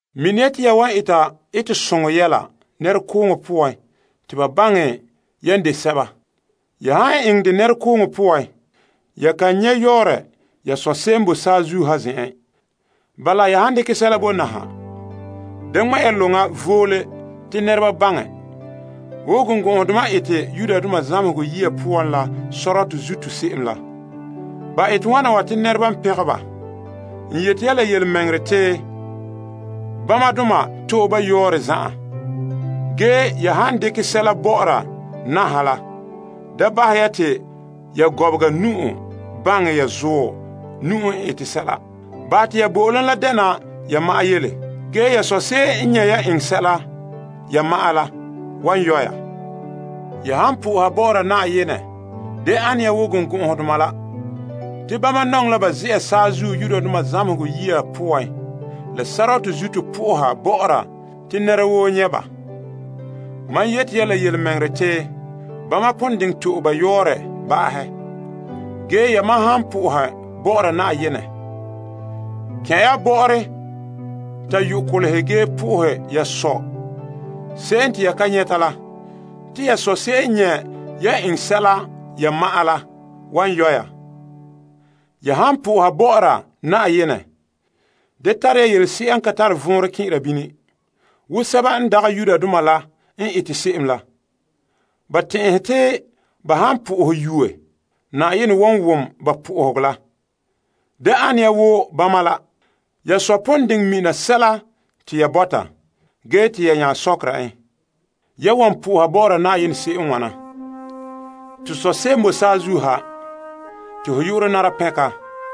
Mini ya te ya da eta etesoŋɔ yɛla nɛrekooŋɔ poan te ba baŋɛ yan de sɛba. Ya han eŋɛ dɛ nɛrekooŋɔ poan ya kan nyɛ' yɔɔrɛ ya Sɔ' n boe saazuo ha zen'en. Bala, ya han dekɛ sɛla bo naha, da ŋmɛ' ya loŋa voole te nɛreba baŋɛ, wo birikɔgɔdoma n ete zamehegɔ yiya poan la sɔrɔtɔ zuto se'em la. Ba ete wana wa te nɛreba n pɛngɛ ba. N yeti ya la yelemɛŋɛrɛ te, bamadoma to'e ba yɔɔrɛ zan'an. Ya han dekɛ sɛla bɔ'ɔra naha la, da bahɛ ya te ya gɔbega nu'uhe baŋɛ ya zuɔ nu'uhe n ete sɛla. Bahɛ te ya bo'olom la dɛna ya ma'an yele. Ge ya Sɔ' n nyɛ' yan eŋɛ sɛla ya ma'an la, wan yɔ' ya. Ya han soha Na'ayenɛ, da ane ya wo birikɔgɔdoma la! Te bama nɔŋɛ la ba ze'a zamehegɔ yiya poan la sɔrɔtɔ zuto soha te nɛra woo nyɛ' ba. Mam yeti ya la yelemɛŋɛrɛ te bama pon diŋɛ to'e ba yɔɔrɛ ba'ahɛ. Yamam han soha Na'ayenɛ, kɛn' ya bɔ'ɔren ta yo' kolehe ge soha ya Sɔ' la te ya ka nyɛta la. Te ya Sɔ' n nyɛ' yan eŋɛ sɛla ya ma'an la wan yɔ' ya. Ya han soha Na'ayenɛ, da tare ya yelese'a n ka tare vɔnrɛ kɛn'ɛra bini, wo sɛba n ka mi Yenɛ la n ete se'em la. Ba tɛn'ɛhɛ te ba han sohora yuura, Na'ayenɛ wan wom ba sohoga la. Da ane ya wo bama la. Ya Sɔ' pon diŋɛ mina sɛla te ya bɔta, ge te ya nya sɔkera en. Soha Yenɛ se'em n wana: To Sɔ' n boe saazuo ha, ho yu'urɛ nara pɛnka,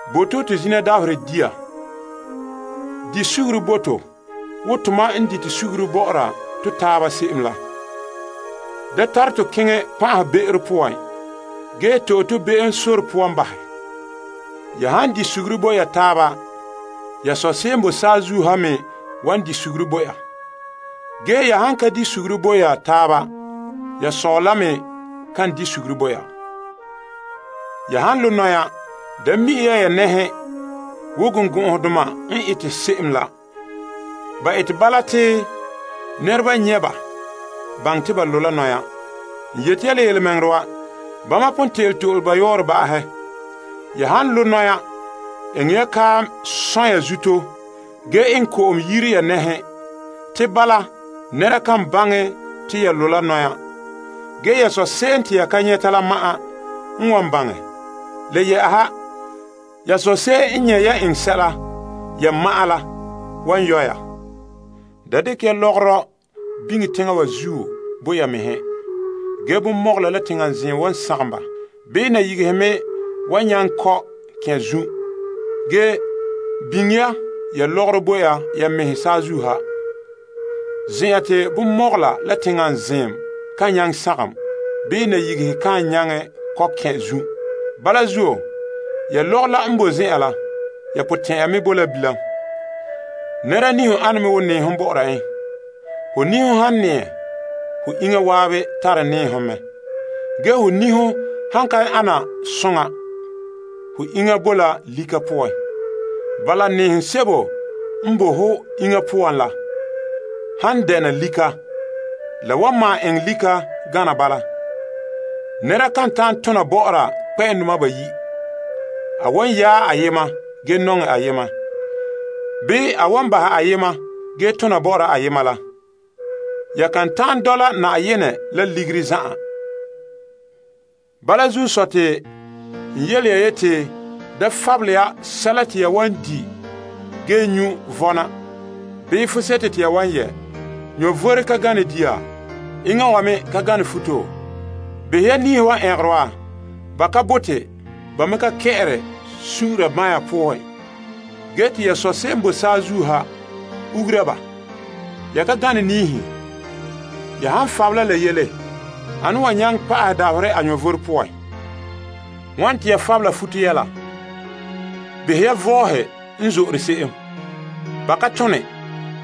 Bo' to to zina dabaherɛ dia. Bahɛ to be'em bo to wo tomam n dite suguru bɔ'ɔra to taaba se'em la. Da tare tɔ keŋɛ pan'ahe be'ero poan ge to'e to be'emdaana nu'uhen bahɛ. Ya han di suguru bo taaba, ya Sɔ' se'em n boe saazuo ha me wan bahɛ ya be'em bo ya. Ge ya han ka di suguru bo ya taaba, ya Sɔ' la me kan bahɛ ya be'em bo ya. Ya han bɔna zagahɛ mɛŋa poan da mi'e ya nɛhe wo birikɔgɔdoma n ete se'em la. Ba ete bala te nɛreba nyɛ' ba baŋɛ te ba boe la zagahɛ mɛŋa poan. N yeti ya la yelemɛŋɛrɛ wa, bama pon te'ele to'e ba yɔɔrɛ ba'ahɛ. Ya han bɔna zagahɛ mɛŋa poan, eŋɛ ya kaam sɔn' ya zuto ge eŋɛ ko'om yire ya nɛhe. Bala te nɛra kan baŋɛ te ya zagahɛ mɛŋa ge ya Sɔ' se'em te ya ka nyɛta la ma'an n wan baŋɛ. Le yɛ'ɛha, ya Sɔ' se'em n nyɛ' yan eŋɛ sɛla ya ma'an la wan yɔ' ya. Da dekɛ ya lɔgɔrɔ biŋe teŋa wa zuo bo ya mɛhe te bonmɔgɔla la teŋa zeem wan sagom ba bii nayigehe me wan kɔ' kɛn' zun'. Ge biŋe ya ya lɔgɔrɔ bo ya mɛhe saazuo ha, zen'an te bonmɔgɔla la teŋa zeem ka nyaŋɛ sagom bii nayigehe ka nyaŋɛ kɔ' kɛn' zun'. Ya lɔgɔrɔ n boe zen'an la, ya potɛn'ɛra me boe la bilam. Nɛra niho ane me wo nɛɛhom bɔ'ɔra en. Ho niho han nɛɛ, ho iŋa zan'an tare nɛɛhom mɛ. Ge ho niho han ka ana soŋa, ho iŋa la boe la lika poan. Bala, nɛɛhom sebo n boe ho iŋa poan la han dɛna lika, la wan malom eŋɛ lika gana bala. Nɛra kan ta'an tona bɔ'ɔra kpɛ'ɛndoma bayi'. A wan yaɛ ayema ge nɔŋɛ ayema bii a wan bahɛ ayema ge tona bɔ'ɔra ayema la. Ya kan ta'an dɔla Yenɛ la Ligiri zan'an. Bala zuo, n yele ya te ya da fabela sɛla te ya wan di' ge nyu' vɔna bii fuseto to ya wan yɛ'. Vom ka gane dia? Iŋa wa me ka gane futo? Behɛ ya niihe wa n ɛngere wa. Ba ka bore, ba me ka kɛ'ɛre sun'unra banya poan, ge te ya Sɔ' n boe Saazuo ha ugura ba. Ya ka gane niihe? Ya han fabela la yele, ane n wan nyaŋɛ pa'ahɛ dabaherɛ a vom poan? Wane te ya fabela futo yɛla? Behɛ ya mɔpuuro n zo'ore se'em. Ba ka tone.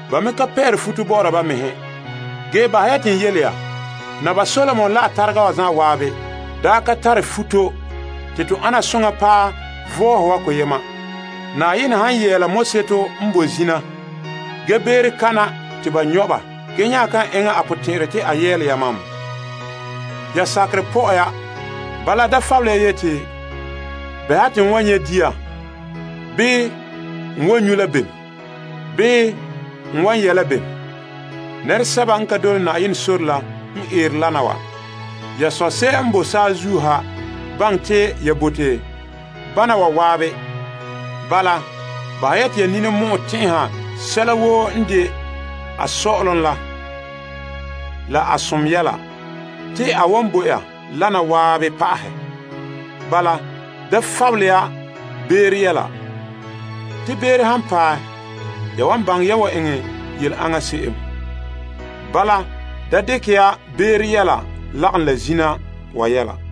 Ba me ka pɛ'ɛre futo bɔ'ɔra ba mɛhe. Ge bahɛ ya te n yele ya, Naba Solomon la a tarega wa zan'an daa ka tare futo te to ana soŋa paɛ mɔpuuro wa la koyena. Yenɛ han yɛɛla mɔseto n boe zina ge beere te ba nyɔ' ba, ge nya kan eŋɛ a potɛn'ɛrɛ te a yɛɛlɛ yamam? Ya sakerɛ pɔ'ɛ ya. Bala, da fabele ya yeti, Bɛha te n wan nyɛ' dia? Bii, N wan nyu' la bem? Bii, N wan yɛ' la bem? Nɛresɛba n ka dole Yenɛ sore la n eere wana wa. Ya Sɔ' n boe saazuo ha baŋɛ te ya bote bana wa zan'an. Bahɛ ya te ya ninimɔ'ɛ tɛn'ɛha sɛla woo n de a sɔ'ɔlom la, la a som yɛla, te a wan bo ya wana zan'an pa'ahɛ. Bala, da fabele ya beere yɛla. Te beere han paɛ, ya wa baŋɛ ya wan eŋɛ yele aŋa se'em. Da dekɛ ya beere yɛla lagom la zina wa yɛla.